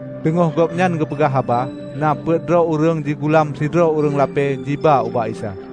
Teungoh gobnyan geupeugah haba, na peuet droe ureuëng jigulam sidroe ureuëng lapée jiba ubak Isa.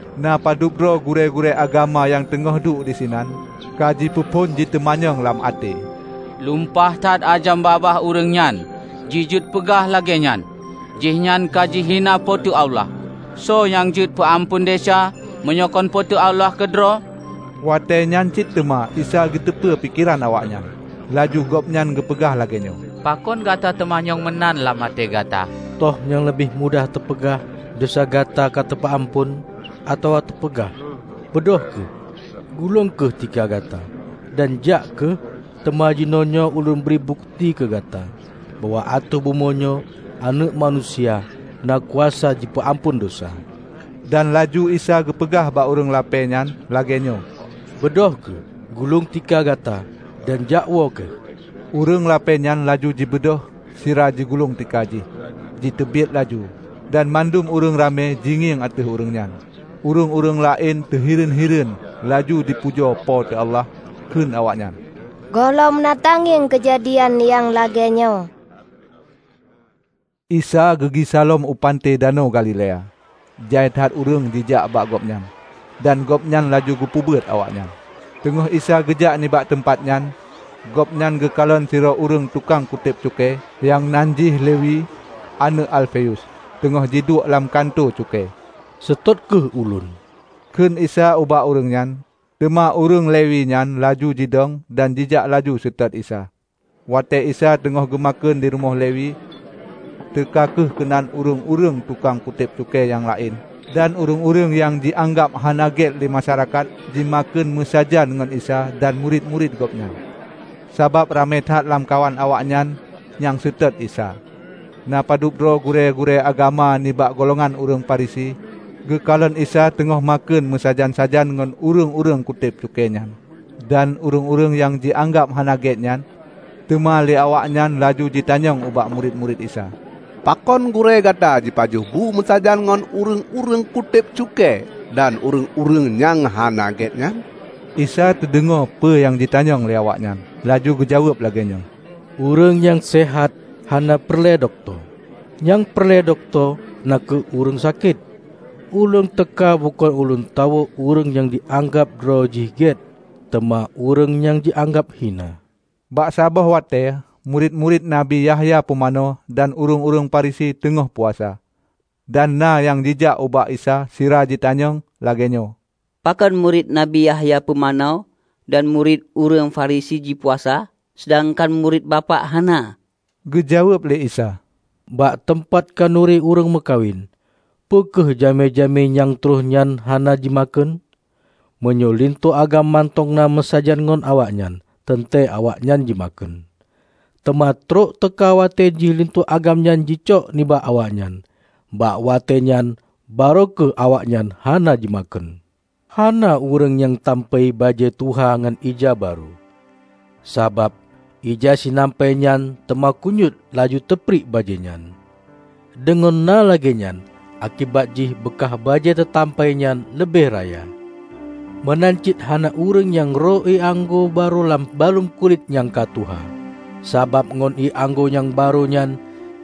Na padub droe gurée-gurée agama nyang teungoh duek disinan, ka jipeuphon jiteumanyong lam até, "Lumpah that ajam babah ureuëng nyan jijeuet peugah lagée nyan! Jihnyan ka jihina Po teu Allah. Soe nyang jeuet peu amphon desya, meunyoe kon Po teu Allah keudroe?" Watée nyan cit teuma Isa geuteupeue pikeran awaknyan. Laju Gobnyan geupeugah lagée nyoe, "Pakon gata teumanyong meunan lam até gata? Toh nyang leubeh mudah teupeugah, 'Desya gata ka teupeu amphon', atawa teupeugah, 'Beudôh kheueh, gulong kheueh tika gata dan jak kheueh'? Teuma jinoenyoe Ulôn bri bukeuti keu gata bahwa ateueh bumoe nyoe Aneuëk Manusia na kuasa jipeu amphon desya." Dan laju Isa geupeugah ubak ureuëng lapée nyan lagée nyoe, "Beudôh kheueh, gulong tika gata dan jakwoe kheueh!" Ureuëng lapée nyan laju jibeudôh sira jigulong tika jih jiteubiet laju dan mandum ureuëng ramé jingieng ateueh ureuëng nyan. Ureuëng-ureuëng laén teuhireuen-hireuen laju jipujoe Po teu Allah. Kheun awaknyan, "Gohlom na tangieng keujadian nyang lagée nyoe!" Isa geugisa lom u panté Danau Galilea. Jai that ureuëng jijak ubak Gobnyan, dan Gobnyan laju geupeubeuet awaknyan. Teungoh Isa geujak nibak teumpat nyan, gobnyan geukalon sidroe ureuëng tukang kutéb cukée nyang nan jih Lewi, aneuëk Alfeus, teungoh jiduek lam kantô cukée. "Seutôt kheueh ulôn," Kheun Isa ubak ureuëng nyan. Teuma ureuëng Lewi nyan laju jidong dan jijak laju jiseutôt Isa. Watée Isa teungoh geumakheun di rumoh Lewi, teuka kheueh keunan ureuëng-ureuëng tukang kutéb cukée nyang laén dan ureuëng-ureuëng nyang jianggab hana gét lé masyarakat jimakheun meusajan ngon Isa dan murit-murit Gobnyan. Sabab ramé that lamkawan awaknyan nyang seutôt Isa. Na padub droe gurée-gurée agama nibak golongan ureuëng Farisi geukalon Isa teungoh makheun meusajan-sajan ngon ureuëng-ureuëng kutéb cukée nyan dan ureuëng-ureuëng nyang jianggab hana gét nyan. Teuma lé awaknyan laju jitanyong ubak murit-murit Isa, "Pakon gurée gata jipajoh bu meusajan ngon ureuëng-ureuëng kutéb cukée dan ureuëng-ureuëng nyang hana gét nyan?" Isa teudeungoe peue nyang jitanyong lé awaknyan, laju geujaweueb lagée nyoe, "Ureuëng nyang seuhat hana peureulée dokto; nyang peureulée dokto na kheueh ureuëng sakét. Ulôn teuka bukon lôn tawök ureuëng nyang jianggab droe jih gét, teuma ureuëng nyang jianggab hina." Bak saboh watée murit-murit Nabi Yahya Pumanö dan ureuëng-ureuëng Farisi teungoh puasa. Dan na nyang jijak ubak Isa sira jitanyong lagée nyoe, "Pakon murit Nabi Yahya Pumanö dan murit ureuëng Farisi jipuasa, seudangkan murit Bapak hana?" Geujaweueb lé Isa, "Bak teumpat khanuri ureuëng meukawen, peu kheueh jamé-jamé nyang troh nyan hana jimakheun? Meunyoe linto agam mantong na meusajan ngon awaknyan, teuntée awaknyan jimakheun. Teuma trok teuka watée jih linto agam nyan jicok nibak awaknyan. Bak watée nyan barô kheueh awaknyan hana jimakheun. Hana ureuëng nyang tampai bajée tuha ngon ija barô. Sabab ija sinampai nyan teuma kunyuét laju teupriek bajée nyan, deungon na lagée nyan akibat jih beukah bajée teutampai nyan leubeh raya. Meunan cit hana ureuëng nyang rô ié anggô barô lam baluem kulét nyang ka tuha. Sabab ngon ié anggô nyang barô nyan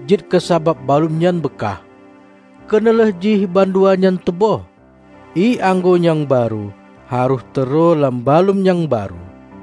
jeuet keusabab baluem nyan beukah. Keuneulheueh jih bandua nyan teuböh. Ié anggô nyang barô harôh teuroe lam baluem nyang barô!"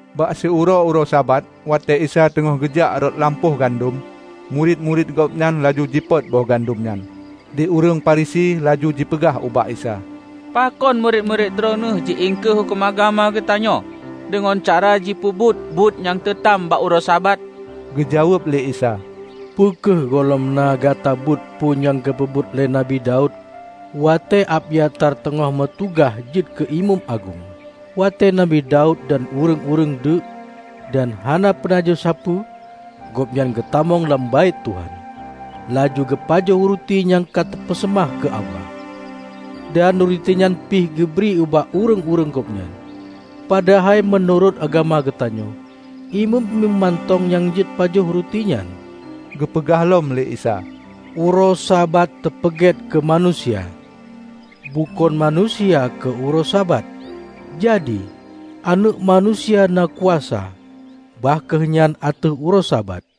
Bak siuroe-uroe Sabat, watée Isa teungoh geujak rot lam lampôh gandom, murit-murit Gobnyan laju jipot boh gandom nyan. Di ureuëng Farisi laju jipeugah ubak Isa, "Pakon murit-murit Droeneueh ji iengkeue huköm agama geutanyoe, deungon cara jipeubuet buet nyang teutam bak uroe Sabat?" Geujaweueb lé Isa, "Peu kheueh gohlom na gata beuet peue nyang geupeubuet lé Nabi Daud, watée Abyatar teungoh meutugaih jeuet keu imeum agong. Watée Nabi Daud dan ureuëng-ureuëng deuk, dan hana peunajoh sapeue, gobnyan geutamong lam Baét Tuhan, laju geupajoh ruti nyang ka teupeuseumah keu Allah. Dan ruti nyan pih geubri ubak ureuëng-ureuëng gobnyan. Padahai meunurot agama geutanyoe, imeum-imeum mantong nyang jeuet pajoh ruti nyan." Geupeugah lom lé Isa, "Uroe Sabat teupeugét keu manusia; bukon manusia keu uroe Sabat. Jadi, Aneuëk Manusia na kuasa, bah kheueh nyan ateueh uroe Sabat."